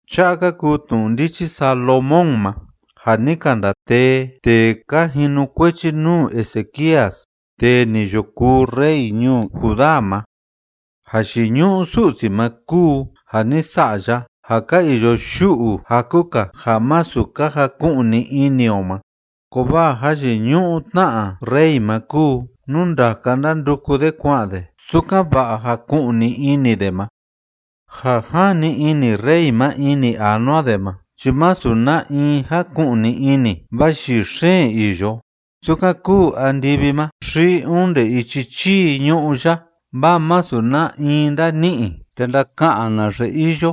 Cha'a ka kuu tnu'u ndichi Salomón ma ja ni ka ndatee tee ka jinukuechi nuu Ezequías tee ni yo kuu rey ñuu Judá ma. Jayiñu'u Su'si ma kúu ja ni sa'a ya ja ka iyo yu'u jaku‑ka ja masu ka jaku'ni ini o ma, kovaa jayiñu'u tna rey ma kúu nú ndaka ndánduku de kua'an de sukan‑va'a jaku'ni ini de ma. Ja jani ini rey ma ini anua de ma chi masu na in jáku'ni ini, vaa yii xeen iyo, sukan kúu andivi ma xi onde ichi chii ñu'ú ya, vaa masu na in ndáni'i te ndaka'an naxe iyo.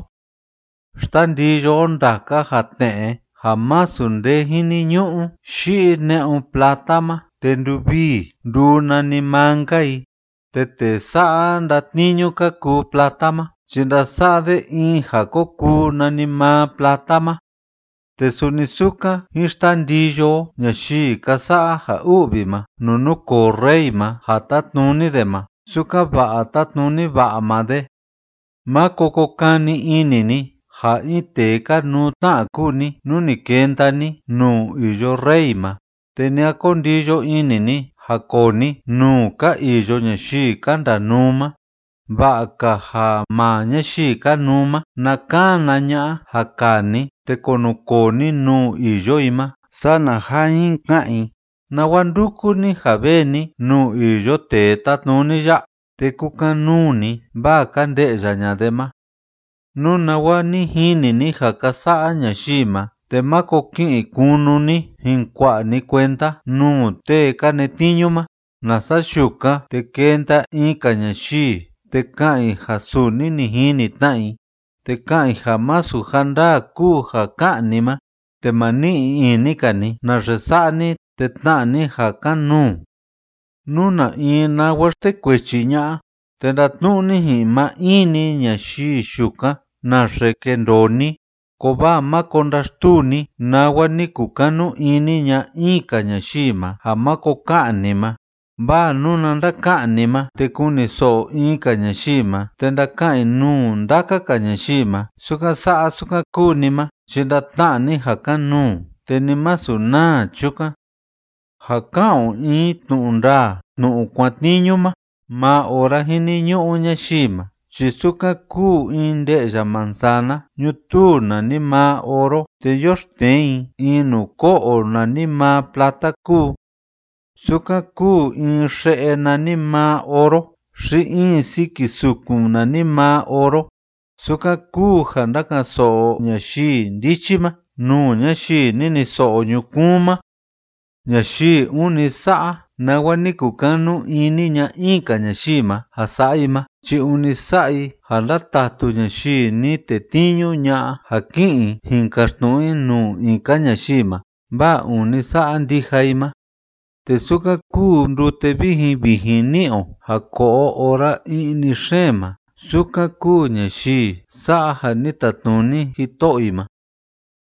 Xtandiyo o ndaka ja tne'e ja masu nde jiniñu'u yi'i ne'un plata ma, te nduvii nduu nanimaa‑nka i, te tee sa'a ndatniñu ka kuu plata ma chi ndasa'a de in ja ko kuu nanimaa plata ma. Te suni sukan jín xtandiyo o ñayii ka sa'a ja u'vi ma nuu núkoo rey ma ja tátnuni de ma, sukan‑va'a tátnuni va'a maa de. Máko ko kani ini ni ja in tee kanuu tna kúu ni nú ni kenda ni nuu iyo rey ma, te ni a ko ndiyo ini ni ja koo ni nuu ka iyo ñayii ka ndanuu ma. Va'a‑ka ja maa ñayii kanuu ma na kana ña'a ja kaa ni te kunukoo ni nuu iyo i ma, sana ja jin ka'an i: “¿Nawa ndúku ni ja vee ni nuu iyo tee tátnuni ya?”, te kukan‑nuu ni vaa ka nde'ya ña'a de ma. Nú nawa ni jini ni ja ka sa'a ñayii ma, te máko ki'in kunu ni jin kua'a ni kuenda nuu tee ka netniñu ma, nasa yukan, te kenda in‑ka ñayii te ka'an i ja suni ni jini tna i te ka'an i ja masu ja ndaa kúu ja ká'an ni ma, te ma ni'i ini‑ka ni naxe sa'a ni te tna'a ni ja kan‑nuu. Nú na in nawa xtekuechi ña'a, te ndatnu'u ni ji'in maa in‑ni ñayii yukan naxe kendoo ni, kovaa máko ndaxtuu ni nawa ni kukanu ini ña'a in‑ka ñayii ma ja máko ka'an ni ma. Vaa nuna ndaka'an ni ma te kuniso'o in‑ka ñayii ma, te ndaka'an i nuu ndaka‑ka ñayii ma sukan sa'a sukan kúu ni ma, chi ndatna'a ni ja kan‑nuu, te ni masu naa chukan. Ja ka'an o in tnu'u ndaa tnu'u kuatniñu ma maa ora jiniñu'u ñayii ma, chi sukan kúu in nde'ya manzana ñutuu nanimaa oro te yoxtnee i in nuu ko'o nanimaa plata kúu. Sukan kúu in xe'e nanimaa oro xi in siki sukun nanimaa oro, sukan kúu ja ndáka'an‑so'o ñayii ndichi ma nuu ñayii niniso'o ñukuun ma. Ñayii ûni sa'a nawa ni kukanu ini ña'a in‑ka ñayii ma ja sa'a i ma chi ûni sa'a i ja ndátatu ñayii ni tetniñu ña'a ja ki'in i jin kaxtnu'u i nuu in‑ka ñayii ma, vaa ûni sa'a ndija i ma. Te sukan kúu ndute vijin vijin ni'i o ja ko'o o ora i'ni xeen ma, sukan kúu ñayii sa'a ja ni tatnuni jito'o i ma.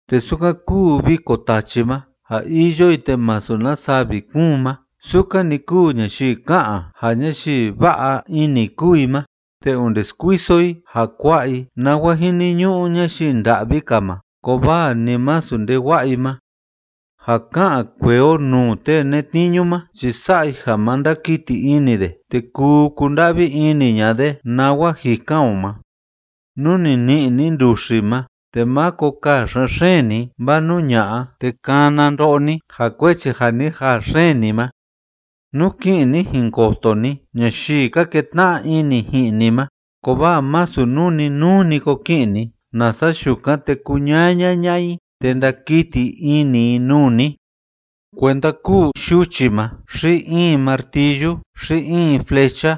Te sukan kúu viko tachi ma ja iyo i te masu na savi kúun ma, sukan‑ni kúu ñayii ká'an ja ñayii va'a ini kúu i ma te onde skuiso i ja kua'a i nawa jiniñu'u ñayii nda'vi‑ka ma kovaa ni masu nde wa'a i ma. Ja ka'an kuee o nuu tee netniñu ma chi sa'a i ja ma ndakiti ini de te kuu kunda'vi ini ña'a de nawa jikan o ma. Nú ni ni'i ni nduxi ma, te máko kaa xen‑xeen ni, vaa nú ña'a, te kana ndo'o ni ja kuechi ja ni jaa xeen ni ma. Nú ki'in ni jin koto ni ñayii ka ketna'a ini ji'in ni ma, kovaa masu nuu‑ni nuu‑ni ko ki'in ni, nasa yukan, te kuñaña ña'a i te ndakiti ini i nuu ni. Kuenda kúu yuchi ma xi in martillu xi in flecha,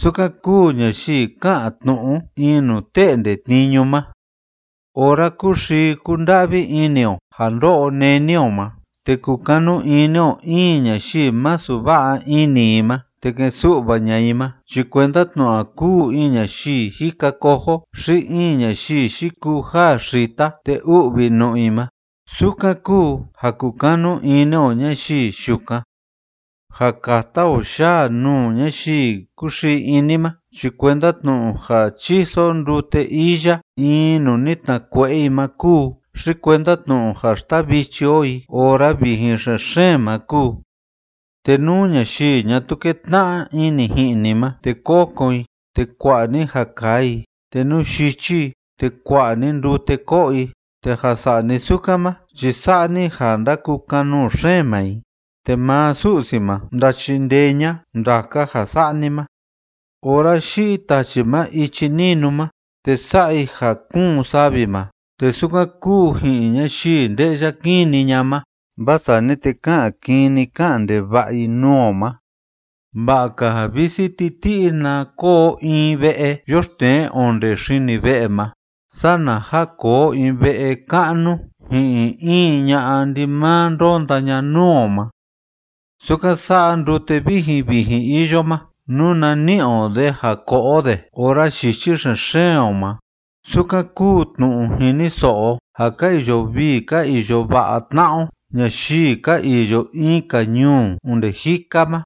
sukan kúu ñayii ká'an tnu'u in nuu te'nde tniñu ma. Ora kúxii kúnda'vi ini o ja ndó'o néni o ma te kukanu ini o in ñayii masu va'a ini i ma te ke'en su'va ña'a i ma, chi kuenda tnu'u ja kúu in ñayii jika cojo xi in ñayii yikuu jaa xita te u'vi nu'u i ma, sukan kúu ja kukanu ini o ñayii yukan. Ja kata o yaa nuu ñayii kúxii ini ma, chi kuenda tnu'u ja chíso o ndute iya in nuu ni tnakue'e i ma kúu, xi kuenda tnu'u ja xtavichi o i ora vijin xen‑xeen ma kúu. Te nú ñayii ñatuu kétna'a ini ji'in ni ma, te kokon i, te kua'a ni ja kaa i, te nú yichi i, te kua'a ni ndute ko'o i, te ja sa'a ni sukan ma chi sa'a ni ja ndakukan‑nuu xeen maa i, te maa Su'si ma ndachindee ña'a ndaka ja sa'a ni ma. Ora yi'i tachi ma ichi ninu ma te sa'a i ja kúun savi ma, te sukan kúu ji'in ñayii nde'ya kini ña'a ma, vaa sani te ká'an kini ká'an ndeva'a i nuu o ma. Va'a‑ka ja visi titi'i na koo o in ve'e yoxtnee onde xini ve'e ma sana ja koo o in ve'e ka'nu ji'in in ña'a ndimaa ndónda ña nuu o ma. Sukan sa'a ndute vijin vijin iyo ma nuna ni'i o de ja ko'o o de ora yichi xen‑xeen o ma, sukan kúu tnu'u jiniso'o o ja ka iyo vii ka iyo va'a tna'a o ñayii ka iyo in‑ka ñuu onde jika ma.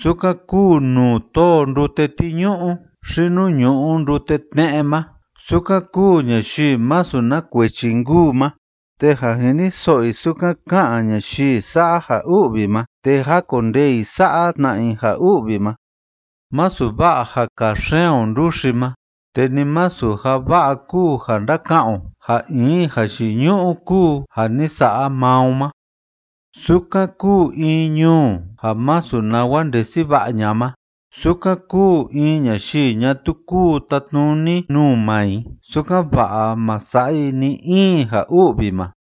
Sukan kuu nuu tóo ndute tiñu'u xi nuu ñu'u ndute tne'e ma, sukan kúu ñayii masu na kuechi nkuu ma, te ja jiniso'o i sukan ká'an ñayii sa'a ja u'vi ma, te jákondee i sa'a tna i ja u'vi ma. Masu va'a ja kaa xeen o nduxi ma, te ni masu ja va'a kúu ja ndaka'an o ja in jayiñu'u kúu ja ni sa'a maa o ma. Sukan kúu in ñuu ja masu nawa ndesi va'a ña'a ma, sukan kúu in ñayii ñatuu kúu tatnuni nuu maa i sukan‑va'a ma sa'a i ni‑in ja u'vi ma.